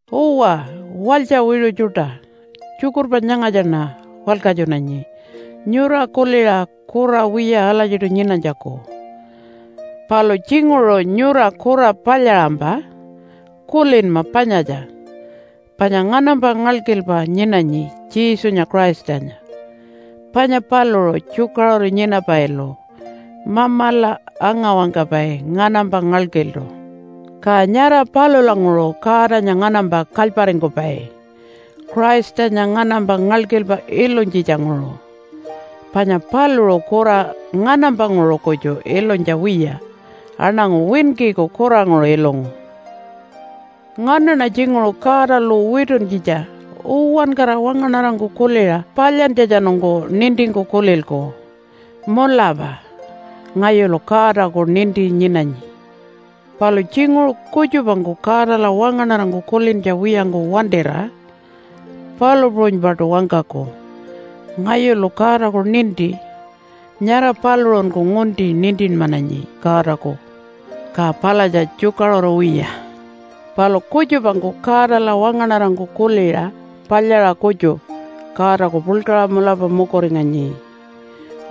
Uwa, walytja wiṟu tjuṯa, tjukurpa nyangatjaṉa walkatjunanyi nyura kuliṟa kura wiya alatjiṯu nyinanytjaku. Palu tjinguṟu nyura kura palyaṟampa kulinma panyatja, panya nganampa ngalkilpa nyinanyi Jesunya Christanya, panya paluṟu tjukaṟuru nyinapailu Mamala anga-wangkapai nganampa ngalkiltu. Ka nyara palulanguṟu Godanya nganampa kalyparingkupai Christanya nganampa ngalkilpa ilunytjitjanguṟu. Panya paluṟu kura nganampanguṟu kutju ilunytja wiya aṉangu winkiku kuranguṟu ilungu. Nganaṉa tjinguṟu Godalu wituntjitja uwankara wangaṉarangku kuliṟa palyantjatjanungku nintingku kulilku, “Mulapa ngayulu Godaku ninti nyinanyi.” Palu tjinguṟu kutjupangku Godala wangaṉarangku kulintja wiyangku wantira palu puṟunypaṯu wangkaku, “Ngayulu Godaku ninti.” Nyara paluṟunku ngunti nintinmananyi Godaku. Ka palatja tjukaṟuru wiya. Palu kutjupangku Godala wangaṉarangku kuliṟa palyaṟa kutju Godaku puḻkaṟa mulapa mukuringanyi.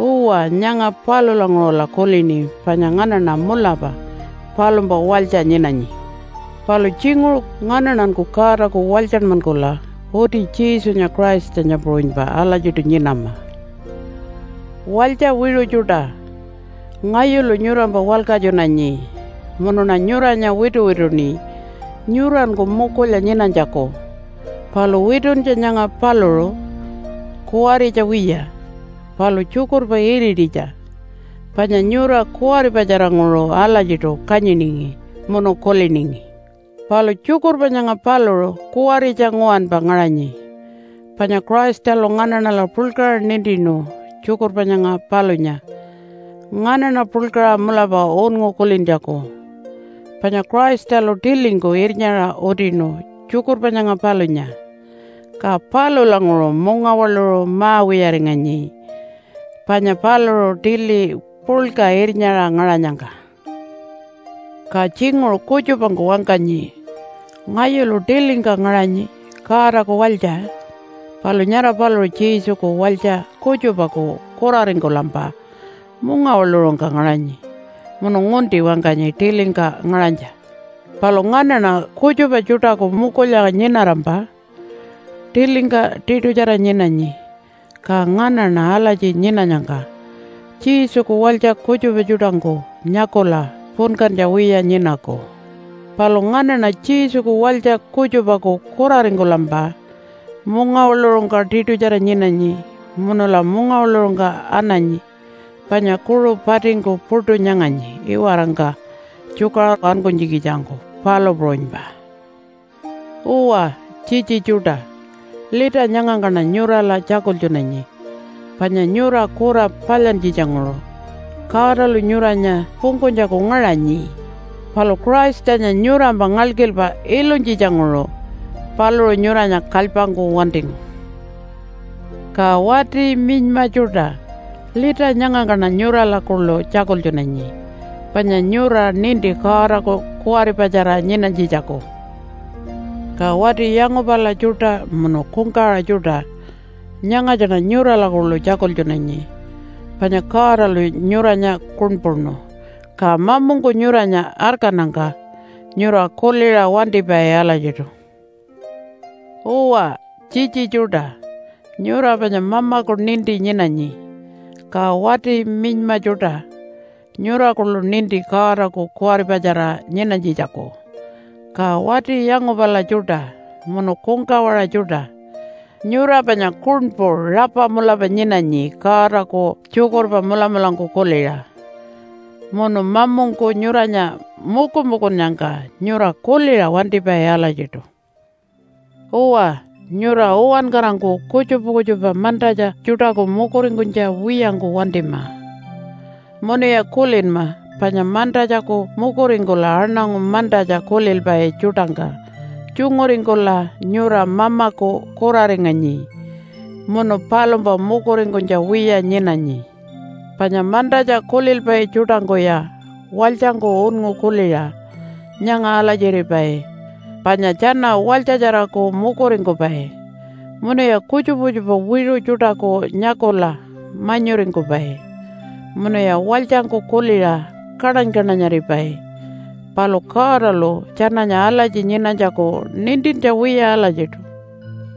Uwa, nyanga palulanguṟula kulini panya nganaṉa mulapa palumpa walytja nyinanyi. Palu tjinguṟu nganaṉanku Godaku walytjanmankula uti Jesunya Christanya puṟunypa alatjiṯu nyinama. Walytja wiṟu tjuṯa, ngayulu nyurampa walkatjunanyi munuṉa nyuranya wituwituṉi nyuranku mukulya nyinanytjaku. Palu wituntja nyanga paluṟu kuwaritja wiya, palu tjukurpa irititja, panya nyura kuwaripatjaranguṟu alatjiṯu kanyiningi munu kuliningi. Palu tjukurpa nyanga paluṟu kuwaritja nguwanpa ngaṟanyi, panya Christalu nganaṉala puḻkaṟa nintinu tjukurpa nyanga palunya nganaṉa puḻkaṟa mulapa unngu kulintjaku. Panya Christalu tilingku irnyaṟa utinu tjukurpa nyanga palunya, ka palulanguṟu mungawaḻuṟu ma-wiyaringanyi panya paluṟu tili puḻka irnyaṟa ngaṟanyangka. Ka tjinguṟu kutjupangku wangkanyi, “Ngayulu tilingka ngaṟanyi, Godaku walytja.” Palu nyara paluṟu Jesuku walytja kutjupaku kuraringkulampa mungawaḻuṟungka ngaṟanyi munu ngunti wangkanyi tilingka ngaṟanytja. Palu nganaṉa kutjupa tjuṯaku mukulya nyinarampa tilingka tiṯutjara nyinanyi. Ka nganaṉa alatji nyinanyangka Jesuku walytja kutjupa tjuṯangku nyakula punkantja wiya nyinaku. Palu nganaṉa Jesuku walytja kutjupaku kuraringkulampa mungawaḻuṟungka tiṯutjara nyinanyi munula mungawaḻuṟungka ananyi panya kuṟu patingku puṯu nyanganyi iwarangka tjukaṟuru ankunytjikitjangku, palu puṟunypa. Uwa tjitji tjuṯa, lita nyangangkaṉa nyurala tjakultjunanyi panya nyura kura palyantjitjanguṟu Godalu nyuranya pungkunytjaku ngaṟanyi, palu Christanya nyurampa ngalkilpa ilunytjitjanguṟu paluṟu nyuranya kalypangku wantingu. Ka wati minyma tjuṯa, lita nyangangkaṉa nyurala kuḻu tjakultjunanyi panya nyura ninti Godaku kuwaripatjara nyinanytjitjaku. Ka wati yangupala tjuṯa munu kungkawaṟa tjuṯa, nyangatjaṉa nyurala kuḻu tjakultjunanyi panya Godalu nyuranya kuṉpuṉu, ka mamungku nyuranya arkannyangka nyura kuliṟa wantipai alatjiṯu. Uwa tjitji tjuṯa, nyura panya Mamaku ninti nyinanyi. Ka wati minyma tjuṯa nyura kuḻu ninti Godaku kuwaripatjara nyinanytjitjaku. Ka wati yangupala tjuṯa munu kungkawaṟa tjuṯa, nyura panya kuṉpu rapa mulapa nyinanyi Godaku tjukurpa mulamulangku kuliṟa, munu mamungku nyuranya mukumukunnyangka nyura kuliṟa wantipai alatjiṯu. Uwa, nyura uwankarangku kutjupa kutjupa mantatja tjuṯaku mukuringkunytja wiyangku wantima. Munuya kulinma panya mantatjaku mukuringkula aṉangu mantatja kulilpai tjuṯangka tjunguringkula nyura Mamaku kuraringanyi munu palumpa mukuringkunytja wiya nyinanyi. Panya mantatja kulilpai tjuṯangkuya walytjangku unngu kuliṟa nyanga alatjiripai panya tjana walytjatjaraku mukuringkupai, munuya kutjupa kutjupa wiṟu tjuṯaku nyakula manyuringkupai, munuya walytjangku kuliṟa kaṉany-kaṉanyaripai. Palu Godalu tjananya alatji nyinanytjaku nintintja wiya alatjiṯu.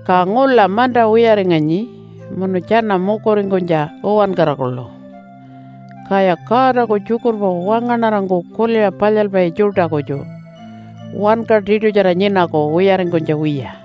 Ka ngula manta wiyaringanyi munu tjana mukuringkunytja uwankara kuḻu. Kaya Godaku tjukurpa wangaṉarangku kuliṟa palyalpai tjuṯa kutju wanka tiṯutjara nyinaku wiyaringkunytja wiya.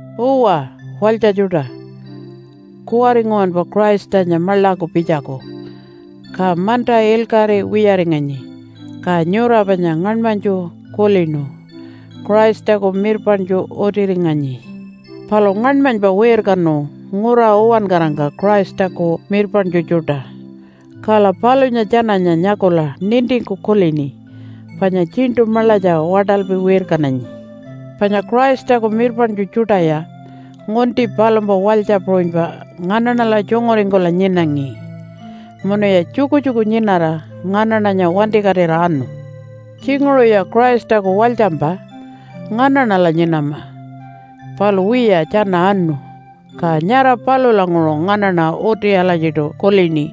Uwa, walytja tjuṯa, kuwari nguwanpa Christanya maḻaku pitjaku, ka manta ilkaṟi wiyaringanyi. Ka nyura panya ngaṉmanytju kulinu Christaku mirpaṉtju utiringanyi. Palu ngaṉmanypa wirkanu ngura uwankarangka Christaku mirpaṉtju tjuṯa. Kala palunya tjananya nyakula nintingku kulini panya tjiṉṯu maḻatja waṯalpi wirkananyi. Panya Christaku mirpaṉtju tjuṯaya ngunti palumpa walytja puṟunypa nganaṉala tjunguringkula nyinangi. Munuya tjukutjuku nyinara nganaṉanya wantikatira anu. Tjinguṟuya Christaku walytjampa nganaṉala nyinama, palu wiya tjana anu. Ka nyara palulanguṟu nganaṉa uti alatjiṯu kulini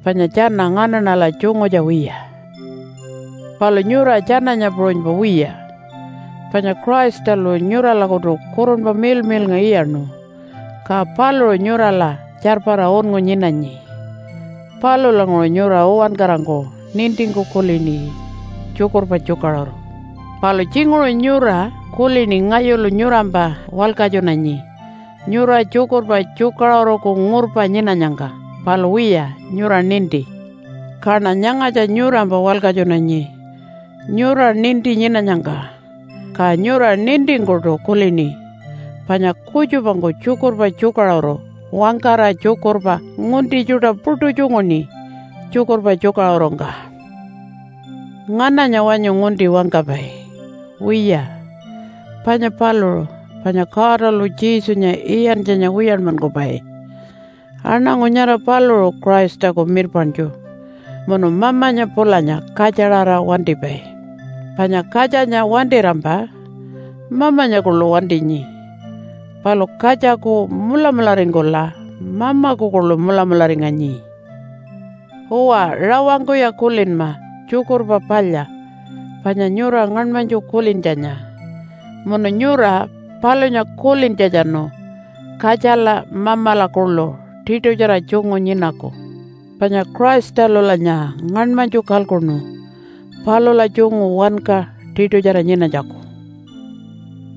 panya tjana nganaṉala tjungutja wiya. Palu nyura tjananya puṟunypa wiya, panya Christalu nyuralakutu Kurunpa Miḻmiḻnga iyaṉu, ka paluṟu nyurala tjarpara unngu nyinanyi. Palulanguṟu nyura uwankarangku nintingku kulini tjukurpa tjukaṟuru. Palu tjinguṟu nyura kulini ngayulu nyurampa walkatjunanyi nyura tjukurpa tjukaṟuruku ngurpa nyinanyangka. Palu wiya, nyura ninti. Kaṉa nyangatja nyurampa walkatjunanyi nyura ninti nyinanyangka. Ka nyura nintingkuṯu kulini panya kutjupangku tjukurpa tjukaṟuru wangkara tjukurpa ngunti tjuṯa puṯu tjunguṉi tjukurpa tjukaṟurungka. Ngananya wanyu ngunti wangkapai? Wiya, panya paluṟu, panya Godalu Jesunya iyantjanya wiyanmankupai. Aṉangu nyara paluṟu Christaku mirpaṉtju munu Mamanya pulanya Katjaṟara wantipai. Panya Katjanya wantirampa Mamanya kuḻu wantinyi, palu katjaku mulamularingkula Mamaku kuḻu mulamularinganyi. Uwa, rawangkuya kulinma tjukurpa palya panya nyura ngaṉmanytju kulintjanya, munu nyura palunya kulintjatjanu Katjala Mamala kuḻu tiṯutjara tjungu nyinaku. Panya Christalulanya ngaṉmanytju kalkuṉu palula tjungu wanka tiṯutjara nyinanytjaku.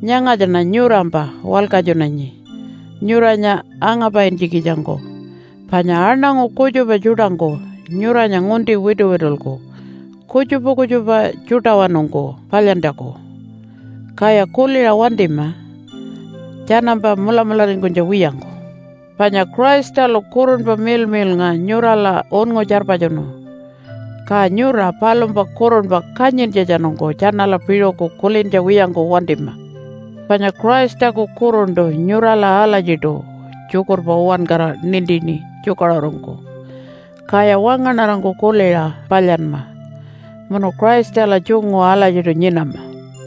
Nyangatjaṉa nyurampa walkatjunanyi nyuranya angapaintjikitjangku, panya aṉangu kutjupa tjuṯangku nyuranya ngunti wituwitulku kutjupa kutjupa tjuṯawanungku palyantjaku. Kaya kuliṟa wantima tjanampa mulamularingkunytja wiyangku. Panya Christalu Kurunpa Miḻmiḻnga nyurala unngu tjarpatjunu. Ka nyura palumpa kurunpa kanyintjatjanungku tjanala piṟuku kulintja wiyangku wantima. Panya Christaku kuruntu nyurala alatjiṯu tjukurpa uwankara nintini tjukaṟurungku. Kaya wangaṉarangku kuliṟa palyanma munu Christala tjungu alatjiṯu nyinama.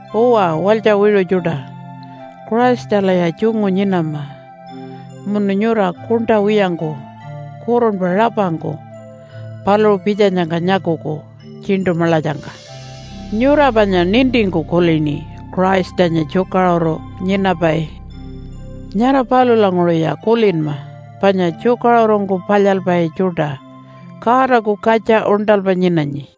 Uwa walytja wiṟu tjuṯa, Christalaya tjungu nyinama munu nyura kuṉṯa wiyangku kurunpa rapangku paluṟu pitjanyangka nyakuku tjiṉṯu maḻatjangka. Nyura panya nintingku kulini Christanya tjukaṟuru nyinapai. Nyara palulanguṟuya kulinma panya tjukaṟurungku palyalpai tjuṯa Godaku katja uṉṯalpa nyinanyi.